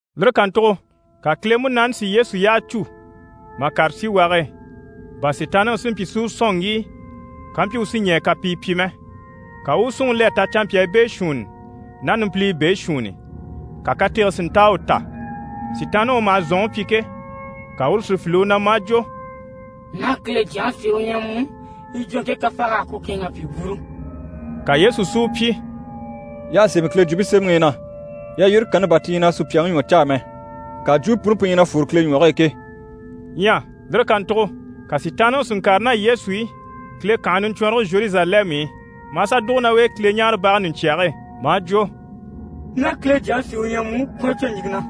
Lire kàntugo ka Kile Munaani si Yesu yyaha cû mà kàre síwage e, bà Sitaanniŋi si mpyi si u sɔ̀n ŋgíi kampyi u sí ɲɛɛ kapii pyi mɛ. Ka u u súnŋi le a ta canmpyaa beeshuunni ná numpiliyi beeshuunni, ka katege si nta a u ta. Sitaanniŋi u maha zɔ̀nŋi pyi ke, ka uru si file u na maa jwo: «Ná Kile Jyaŋi sí u ɲyɛ mu, yi jwo ɲje kafaay'á na yi kɛ̂ɛnŋ'a pyi bwúuru.» Ka Yesu si u pyi: «Y'à sémɛ Kile Jwumpe Semɛŋi i na “Yalyire kanni bà ti ɲyɛ na sùpyaŋi ɲwɔ caa mɛ, ŋka jwumpe puni pu ɲyɛ na fwore Kile ɲwɔge e ke.”» Ɲyɛ lire kàntugo ka Sitaanniŋi si ŋkàre ná Yesu i Kile kànhe niɲcwɔnrɔge Zheruzalɛmu i, maa sà dùgo ná u e Kileɲaarebage ɲùɲcyage e, maa jwo: «Ná Kile Jyaŋi sí u ɲyɛ mu, kwɔ̀n a cwo ɲìŋke na,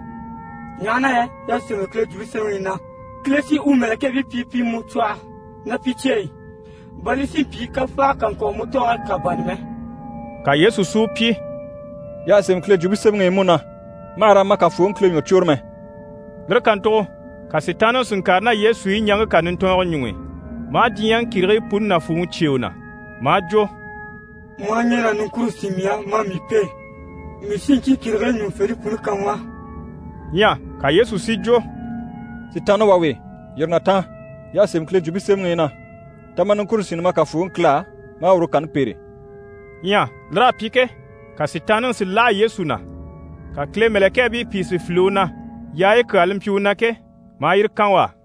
ɲaha na yɛ y'à sémɛ Kile Jwumpe Semɛŋi i na “Kile sí u mɛ̀lɛkɛɛbii pyi pi mu cwɔhɔ ná pi cyeyi i, bà li si mpyi kafaaga kà ŋkwɔ̀ mu tɔɔge kà bânni mɛ.”» Ka Yesu si u pyi: «Y'à sémɛ Kile Jwumpe Semɛŋi i mú na “Ma hà raa ma Kafooŋi Kile ɲwɔ cwôre mɛ.”» Lire kàntugo ka Sitaanniŋi si ŋkàre ná Yesu i ɲaŋke kà nintɔɔnntɔɔngɔ ɲuŋ'i, maa diɲyɛŋi kìrigii puni nàfuuŋi cyêe u na, maa jwo: «Mu aha ɲɛn'a niŋkure sín mii á maa mii pêe, mii sí ɲcyii kìrigii ɲùŋufente puni kan mu á.» Ɲyɛ ka Yesu si jwo «Sitaanna wà we, yîri na taan! Y'à sémɛ Kile Jwumpe Semɛŋi i na “Ta ma niŋkure sínni ma Kafooŋi Kile á, ma a uru kanni pêre.”» Ɲyɛ lir'à pyi ke, ka Sitaanniŋi si láha Yesu na, ka Kile mɛ̀lɛkɛɛbii pìi si file u na, yaayi kyaa li mpyi u na ke, maa yire kan u á.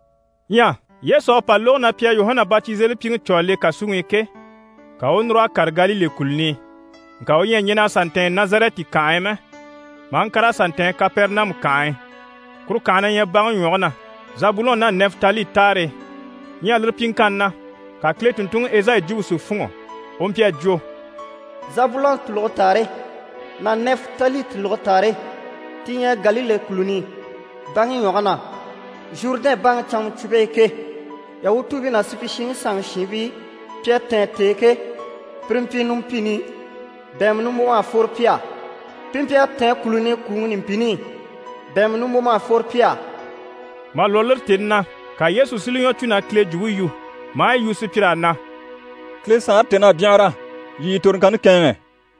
Ɲyɛ Yesu à pa lógo na pi à Yuhana Batizelipyiŋi cû a le kàsuŋi i ke, ka u u núr'a kàre Galile kùluni i. Ŋka u ɲyɛ a sà ntɛ̀ɛn Nazarɛti kànhe e mɛ, maa ŋkàr'a sà ntɛ̀ɛn Kapɛrɛnamu kànhe e. Kuru kànhe na ɲyɛ baŋi ɲwɔge na, Zabulɔn ná Nɛfitali taare e. Ɲyɛ lire pyiŋkanni na, ka Kile tùnntunŋi Ezayi jwumpe si fûnŋɔ. U mpyi a jwo: «Zabulɔn tùluge taare ná Nɛfitali tùluge taare, ti ɲyɛ Galile kùluni i, baŋi ɲwɔge na, Zhurudɛn baŋi canŋacwumpe e ke, Yahutuubii ná supyishiŋi sanŋi shiinbii, pi à tɛ̀ɛn t'e ke, pire mpyi numpini i, bɛ̀ɛnmɛ nimbwom'à fworo pi á, pi mpyi a tɛ̀ɛn kùluni i, kwùŋi numpini i, bɛ̀ɛnmɛ nimbwom'à fworo pi á.» Mà lwɔ́ lire tèni na, ka Yesu si li ɲwɔ cû na Kile jwumpe yu, maa yi yu sùpyir'á na: «Kile Saanre tèn'à byanhara, yii yii toroŋkanni kɛ̂ɛnŋɛ.»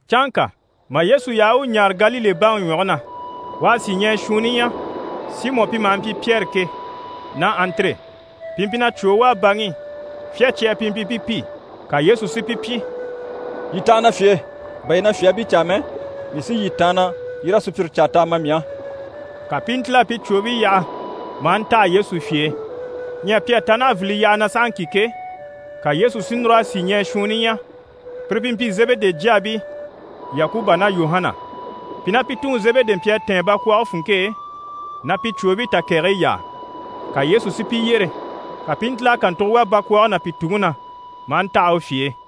Canŋka mà Yesu yaha u u ɲaare Galile baŋi ɲwɔge na, u à sìɲɛɛ shuunni ɲya, Simɔ pi maha mpyi Pyɛri ke, ná Andire. Pi mpyi na cwòo wàa baŋi i. Fyácyaa pi mpyi pi pi. Ka Yesu si pi pyi: «Yii taha na fye e. Bà yii na fyaabii caa mɛ, mii sí yii taanna, yii raa sùpyire caa t'a ma mii á.» Ka pi i ntíl'a pi cwòobii yaha, maa ntaha Yesu fye e. Ɲyɛ pi à ta naha vili yyaha na sahaŋki ke, ka Yesu si núr'a sìɲɛɛ shuunni ɲya, pire pi mpyi Zebede jyaabii Yakuba ná Yuhana. Pi ná pi tuŋi Zebedi mpyi a tɛ̀ɛn bakwɔɔge funŋke e, na pi cwòobii takɛgɛyi yaa. Ka Yesu si pi yyere, ka pi i ntíl'a kàntugo wà bakwɔɔge ná pi tuŋi na, maa ntaha u fye e.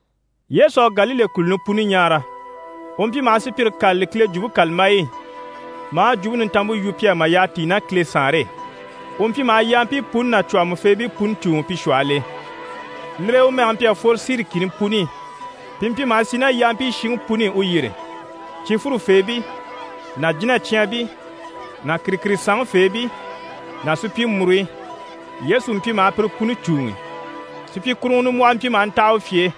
Yesu à Galile kùluni puni ɲaara, u mpyi maha sùpyire kâlali Kile Jwumpe kàlambayi i, maa Jwumpe Nintanmpe yu pi á mà yyaha tíi ná Kile Saanre e. U mpyi maha yampii puni ná cwɔ̀hɔmɔfeebii puni cùuŋi pi shwɔhɔl'e. Lire e u mɛge mpyi a fworo Siri kìni puni i. Pi mpyi maha sì ná yampii shiŋi puni i u yyére: cifwure feebii ná jínacyaanbii ná kìrikirisanŋi feebii ná supyimuruɲyi. Yesu mpyi maha pire puni cùuŋi. Supyikuruŋɔ nimbwɔhɔ mpyi maha ntaha u fye e,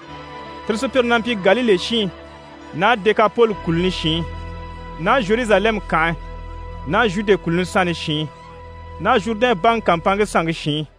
tire sùpyire na mpyi Galile shiin ná Dekapoli kùluni shiin ná Zheruzalɛmu kànhe ná Zhude kùluni sanni shiin ná Zhurudɛn baŋi kàmpanŋke sanŋke shiin.